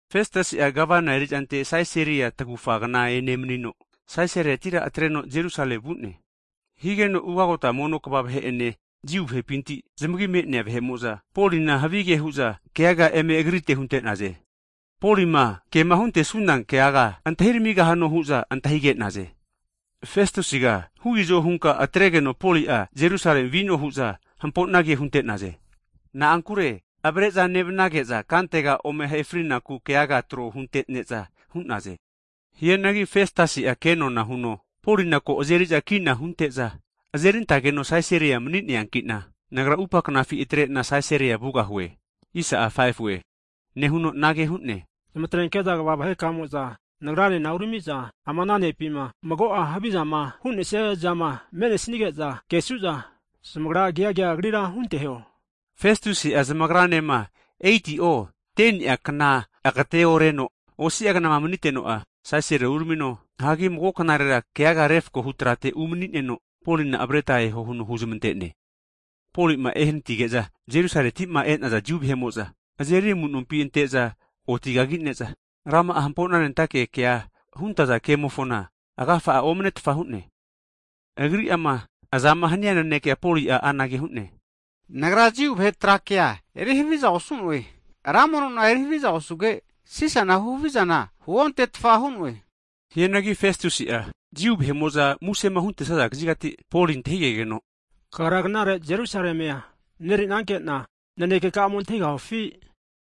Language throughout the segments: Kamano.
Festusi'a Gavana erizante Sisaria tagufa kna enemanino, Sisariatira atreno Jerusalemi vu'ne. Higeno ugagota mono kva vahe'ene Jiu vahepinti zamagi me'nea vahe'mo'za, Polina havige hu'za keaga eme agrite huntenaze. Polima kema huntesuna keaga antahi ramigahano hu'za antahige'naze. Festusiga huizo hunka atregeno Poli'a Jerusalemia vino hu'za hampo'na ke hunte'naze. Na'ankure avare'za nevnage'za kantega ome ahe fri'naku keaga retro hunte'neza hu'naze. Hianagi Festusi'a kenona huno, Polina ko azeri'za kina hunte'za azerintageno Sisaria mani'neanki'na, nagra atupa knafi atrena Sisaria vugahue, hu'ne. Nehuno anage hu'ne, Zamatrenke'za kva vahekamo'za nagrane urami'za, ama ne'mo'ma mago'a havizama hu'nesniazama me'nesige'za kesu'za, zamagra keaga agrira hunteho. Festusi'a zamagranema 8'o 10'a kna agateoreno, osi'a knama maniteno'a Sisaria uramino, hagi mago knarera keaga refakohu trate unemanino, Polina avareta eho huno huzmante'ne. Poli'ma ehanatige'za, Jerusalemiti e'naza Jiu vahe'mo'za, azeri amunompi ante'za otigagine'za, rama'a hamponanentake kea huntaza kemofona agafa omanetfa hu'ne. Agri'ama azama hania nanekea Poli'a anage hu'ne, Nagra Jiu vahe Tra Kea eri haviza osu'noe, ra mono nona eri haviza osuge, Sisana havizana huontetfa hu'noe. Hianagi Festusi'a Jiu vahe'mo'za musema huntesaza kazigati Poli antahigeno, kagra knare Jerusalemia mareri'nanke'na naneke ka'a ome antahigahufi?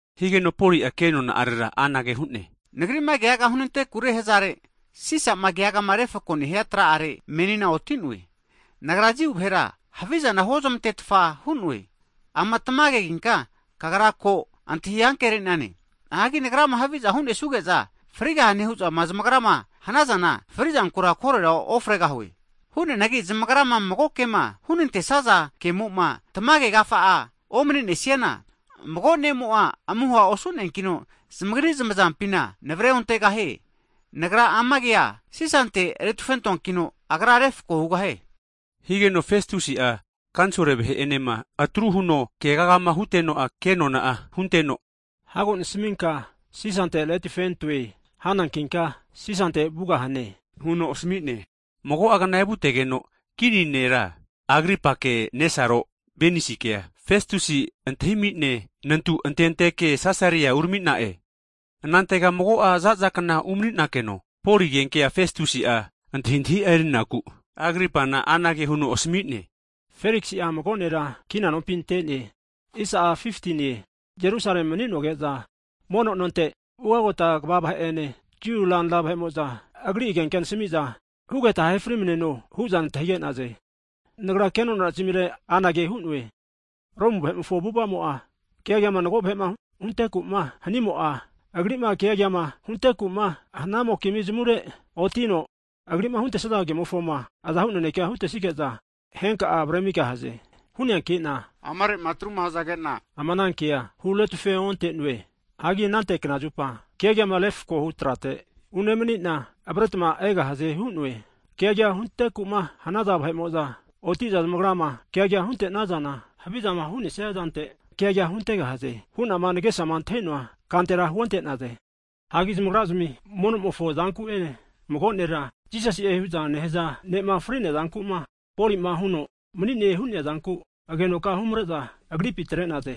Higeno Poli'a kenona'arera anage hu'ne, Nagri'ma keagama hunantekure hazare, Sisa'ma keagama refako nehia tra'are menina oti'noe. Nagra Jiu vahera havizana huozmantetfa hu'noe. Ama tamageginka kagra ko antahi ankere'nane. Hagi nagrama haviza hunesuge'za frigahane hu'za zamagra hanazana, fri'zankura korera ofregahue. Hu'neanagi zamagrama mago kema hunantesaza kemo'ma tamage agafa'ama omanenesiana, mago ne'mo'a amuha osu'neankino zamagri zamazampina navare ontegahie. Nagra ama keaga Sisante retufentoankino agra refako hugahie. Higeno Festusi'a kanisol vahe'enema atru huno keagama huteno'a, ke'nona hunteno, Hago nasaminka Sisante retufentoe hanankinka Sisante vugahane huno asami'ne. Mago'agna evutegeno kini nera Agripake nesaro Benaisikea, Festusi antahimi'ne nantu antenteke Sisaria urami'na'e. Anantega mago'a za'za kna umani'nakeno, Poli agenkea Festusi'a antahintahi'a erinaku Agripana anage huno asmi'ne, Feliksi'a mago nera kina nompi ante'ne. Jerusalemi mani'noge'za, mono nonte ugagota kva (hai pristi) vahe'ene, Jiu ranra (eldas) vahe'mo'za agri agenkea nenasmi'za hugeta ahe frimaneno hu'za nantahige'naze. Nagra kenona zamire anage hu'noe, Romu vahe'mofo avu'ava'mo'a, keagama mago vahe'ma hunteku'ma hanimo'a, agri'ma keagama hunteku'ma hanamokizmi zamure otino, agri'ma huntesaza kemofona azahu nanekea hutesige'za henka avaremigahaze. Hu'neanki'na amare'ma atruma hazage'na, ama ana kea huretufe onte'noe. Hagi anante knazupa keagama refakohu trate unemani'na, avaretma egahaze hu'noe. Keaga hunteku'ma haza vahe'mo'za oti'za zamagrama keaga hunte'nazana, havizama hu'nesia zante keaga huntegahaze hu'na nagesama antahi'noa kantera huonte'naze. Hagi zamagrazmi mono'mofo zanku'ene mago nera Jisasi'e hu'za nehaza ne'ma fri'nea zanku'ma, Poli'ma huno mani'ne hu'nea zanku agenoka humare'za agripi atre'naze.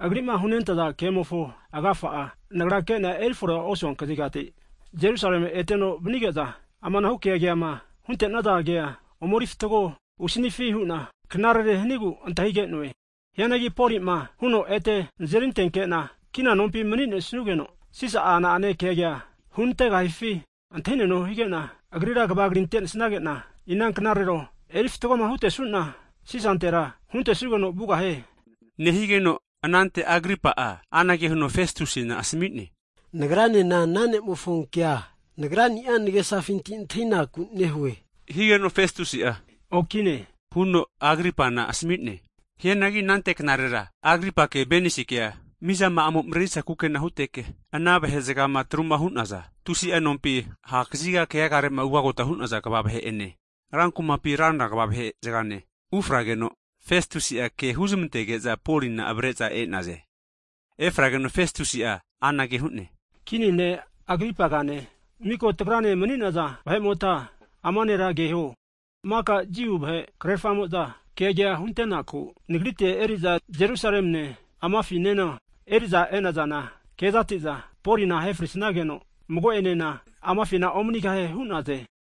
Agri'ma hunentaza kemofo agafa'a, nagra ke'na erifore osua kazigati Jerusalemi eteno vanige'za amanahu keagama hunte'naza kea ome erifatgo husanifi hu'na knarerema hanigu antahige'noe. Hianagi Poli'ma huno ete nazeri antenkena kina nompi mani'nesugeno, Sisa'a na'ane keaga hunantegahifi antahineno hige'na, nagra hanavege huzmantoanki'za, agrira kava krinte'nesagena, inanknarero eri fatgoma hutesu'na, Sisantera (Empra) huntesugeno vugahie. Nehigeno anante Agripa'a anage huno Festusina asami'ne, nagranena ana ne'mofo kea nagra'ni'a nagesafinti antahinaku nehue, higeno Festusi'a okine huno Agripana asami'ne. Hianagi anante knarera, Agripake Benasikea mizama'amo marerisa kukena huteke, ana vahe'zagama atruma hu'naza tusi'a nompi ha' kaziga keagare'ma ugagote'naza kva vahe'ene (commanding officers), rankumapi ranra kva vahe'ene ufrageno Festusi'a ke huzmantege'za Polina avare'za e'naze. Efrageno Festusi'a anage hu'ne, Kini ne' Agripagane miko tagrane mani'naza vahe'motma ama nera keho, maka Jiu vahe krerafamo'za keaga huntenaku nagrite eri'za Jerusalemine amafinema eri'za e'nazana kezati'za, Polina ahe frisnageno mago'enena amafina omanigahie hu'naze.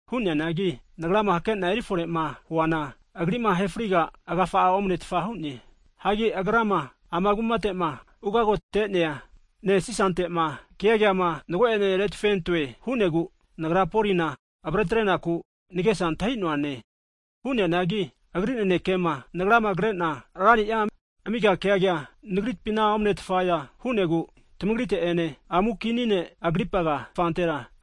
Hu'neanagi nagrama hakena erifore'ma huana, agri'ma ahe friga agafa omanetfa hu'ne. Hagi agrama ana kumate'ma ugagote'nea ne' Sisante'ma keaga'ama mago'ene retufentoe hu'negu, nagra Polina avretrenaku nagesa antahi'noane. Hu'neanagi agri nanekema, nagrama kre'na rani'a (lord) amiga keaga nagripina omanetfaza hu'negu tmagrite'ene amu Kini ne' Agripaga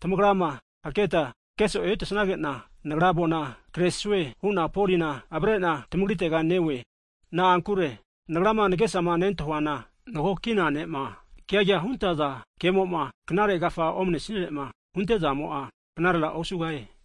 tamagrama haketma keso'e hutesage'na, nagra avona kresue hu'na Polina avare'na tamagritera neoe. Na'ankure nagrama nagesama nentahuana mago kina ne'ma keaga huntaza kemo'ma, knare agafa omnenesire'ma huntezamo'a knarera osugahie.